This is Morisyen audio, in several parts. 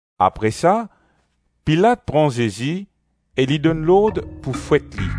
Apre sa Pilat pran Zezi e li donn lord pou fwet li.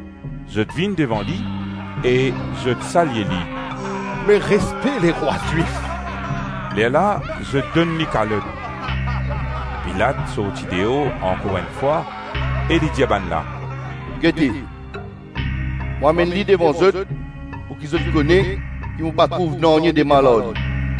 Zot vinn devan li e zot salye li, “Me respe lerwa Zwif!” Lerla zot donn li kalot. Pilat sorti deor ankor enn fwa e li dir bannla, “Gete, mo amenn li devan zot pouki zot kone ki mo pa trouv nanye de mal ar li.”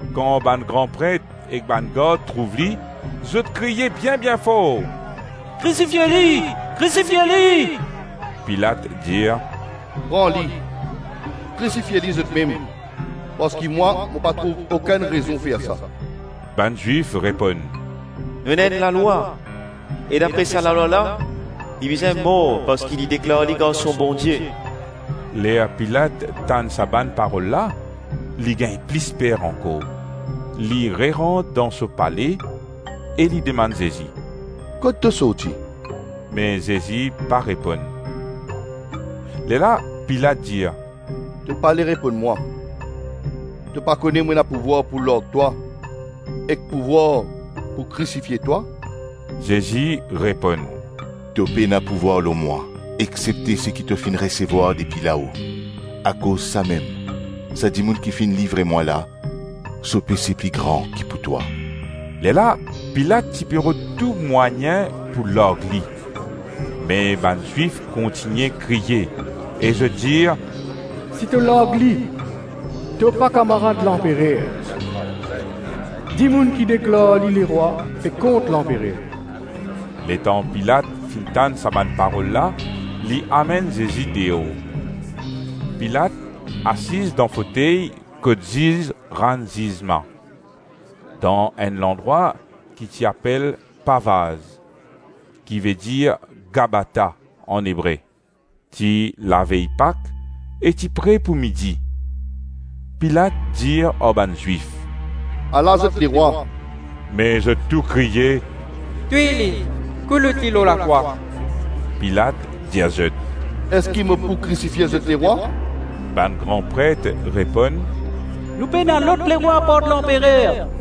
Kan bann gran pret ek bann gard trouv li, zot kriye bien-bien for, “Krisifie li, krisifie li.” Pilat dir, “Pran li, krisifie li zotmem parski mwa, mo pa trouv okenn rezon fer sa.” Bann Zwif reponn, “Nou ena enn lalwa e dapre sa lalwa la, li bizin mor parski li deklar li Garson Bondie.” Ler Pilat tann sa bann parol la, li gagn plis per ankor. Li rerant dan so pale e li demann Zezi, “Kot to sorti?” Me Zezi pa reponn. Lerla Pilat dir, “To pale reponn mwa? To pa kone mo ena pouvwar pou larg twa ek pouvwar pou krisifie twa?” Zezi reponn, “To pena pouvwar lor mwa exsepte seki to finn resevwar depi lao. Akoz samem sa dimoun ki finn livre mwa la, so pese pli gran ki pou twa.” Lerla Pilat ti pe rod tou mwayin pou larg li me bann Zwif kontigne kriye e zot dir, “Si to larg li, to pa kamarad lanperer; dimoun ki deklar li lerwa pe kont lanperer.” Letan Pilat finn tann sa bann parol la, li amenn Zezi deor. Pilat asiz dan fotey kot ziz rann zizman, dan enn landrwa ki ti apel ‘Pavaz’ ki vedir ‘Gabata’ an Ebre. Ti lavey Pak e ti pre pou midi. Pilat dir ar bann Zwif, “Ala zot lerwa.” Me zot tou kriye, “Touy li, koulout li lor lakrwa.” Pilat dir zot, “Eski mo pou krisifie zot lerwa?” Bann gran pret reponn, “Nou pena lot lerwa apart lanperer.”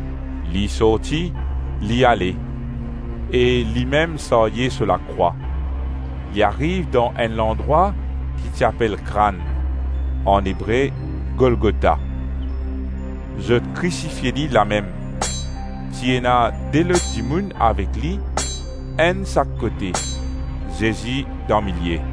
Li sorti, li ale e limem sarye so lakrwa; li ariv dan enn landrwa ki ti apel ‘Krann’, an Ebre: Golgota. Zot krisifie li lamem; ti ena de lot dimoun avek li, enn sak kote, Zezi dan milie.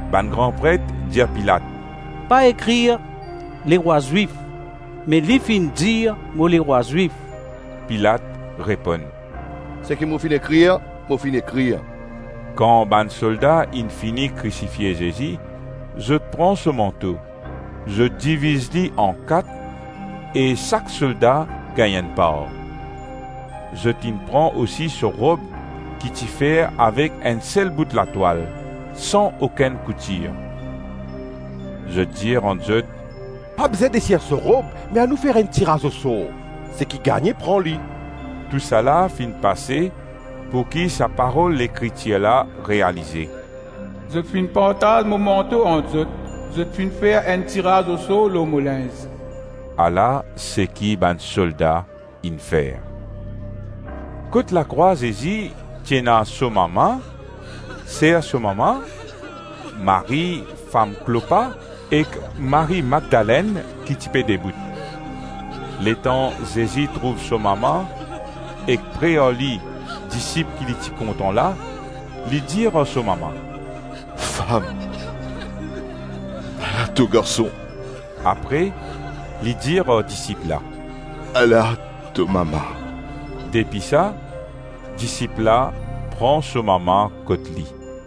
Bann gran pret dir Pilat, “Pa ekrir, ‘Lerwa Zwif’, me ‘Li finn dir mo lerwa Zwif’.” Pilat reponn, “Seki mo finn ekrir, mo finn ekrir.” Kan bann solda inn fini krisifie Zezi, zot pran so manto, zot diviz li an-kat e sak solda gagn enn par. Zot inn pran osi so rob ki ti fer avek enn sel bout latwal, san okenn koutir. Zot dir ant zot, “Pa bizin desir so rob me anou fer enn tiraz osor, seki gagne, pran li.” Tou sa la finn pase pouki sa parol Lekritir la realize, ‘Zot finn partaz mo manto ant zot Zot finn fer enn tiraz osor lor mo linz.’ Ala seki bann solda inn fer. Kot lakrwa Zezi, ti ena so mama, ser so mama, Marie, fam Klopa ek Marie Madlenn ki ti pe debout. Letan Zezi trouv so mama ek pre ar li, disip ki li ti kontan la, li dir ar so mama, “Fam, ala to garson.” Apre li dir ar disip la, “Ala to mama.” Depi sa, disip la pran so mama kot li.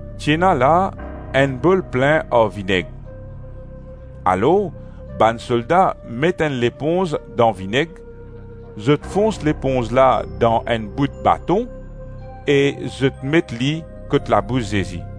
Ti ena la enn bol plin ar vineg; alors bann solda met enn leponz dan vineg, zot fons leponz la dan enn bout baton e zot met li kot labous Zezi.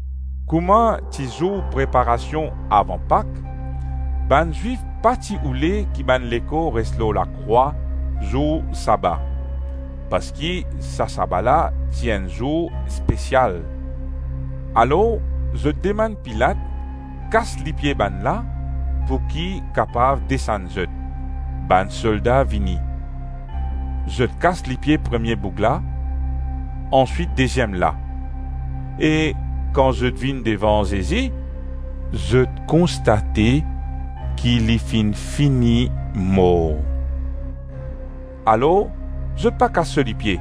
Kouma ti zour preparasion avan Pak, bann Zwif pa ti oule ki bann lekor res lor lakrwa zour saba, (parski sa saba la ti enn zour espesial); alors zot demann Pilat, kas lipie bannla pouki kapav desann zot. Bann solda vini. Zot kas lipie premie boug la, answit deziem la, e kan zot vinn devan Zezi, zot konstate ki li finn fini mor. Alors zot pa kas so lipie.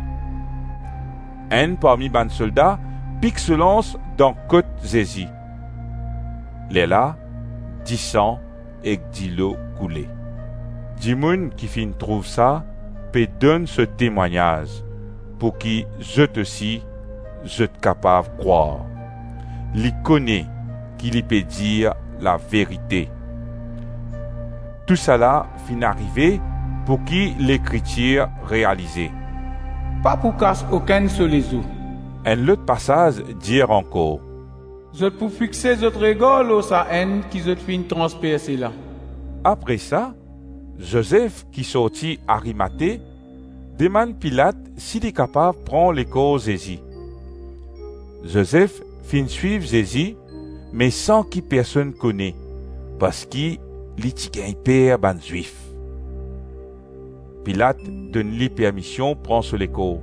Enn parmi bann solda pik so lans dan kot Zezi; lerla disan ek dilo koule. Dimoun ki finn trouv sa pe donn so temwagnaz pouki zot osi, zot kapav krwar; li kone ki li pe dir laverite. Tousala finn arive pouki Lekritir realize, “Pa pou kas okenn so lezo.” Enn lot pasaz dir ankor, “Zot pou fixe zot regar lor Sa-Enn ki zot finn transperse la.” Apre sa, Zozef ki sorti Arimate, demann Pilat si li kapav pran lekor Zezi. (Zozef finn swiv Zezi me san ki personn kone, parski li ti gagn per bann Zwif). Pilat donn li permision pran so lekor.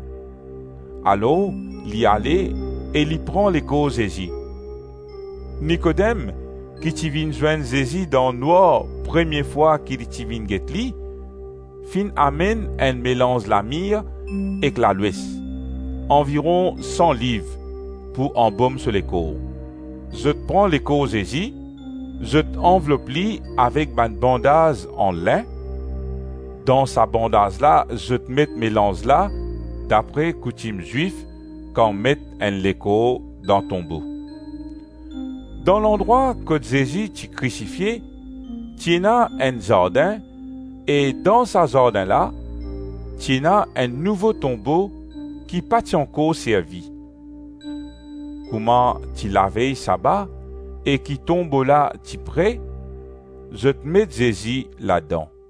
Alors li ale e li pran lekor Zezi. Nikodem, ki ti vinn zwenn Zezi dan nwar premie fwa ki li ti vinn get li, finn amenn enn melanz lamir ek lalwes, anviron san liv pou anbom so lekor. Zot pran lekor Zezi, zot anvlop li avek bann bandaz an lin; dan sa bandaz la zot met melanz la dapre koutim Zwif kan met enn lekor dan tonbo. Dan landrwa kot Zezi ti krisifie, ti ena enn zardin e dan sa zardin la, ti ena enn nouvo tonbo ki pa ti ankor servi. Kouma ti lavey saba e ki tonbo la ti pre, zot met Zezi ladan.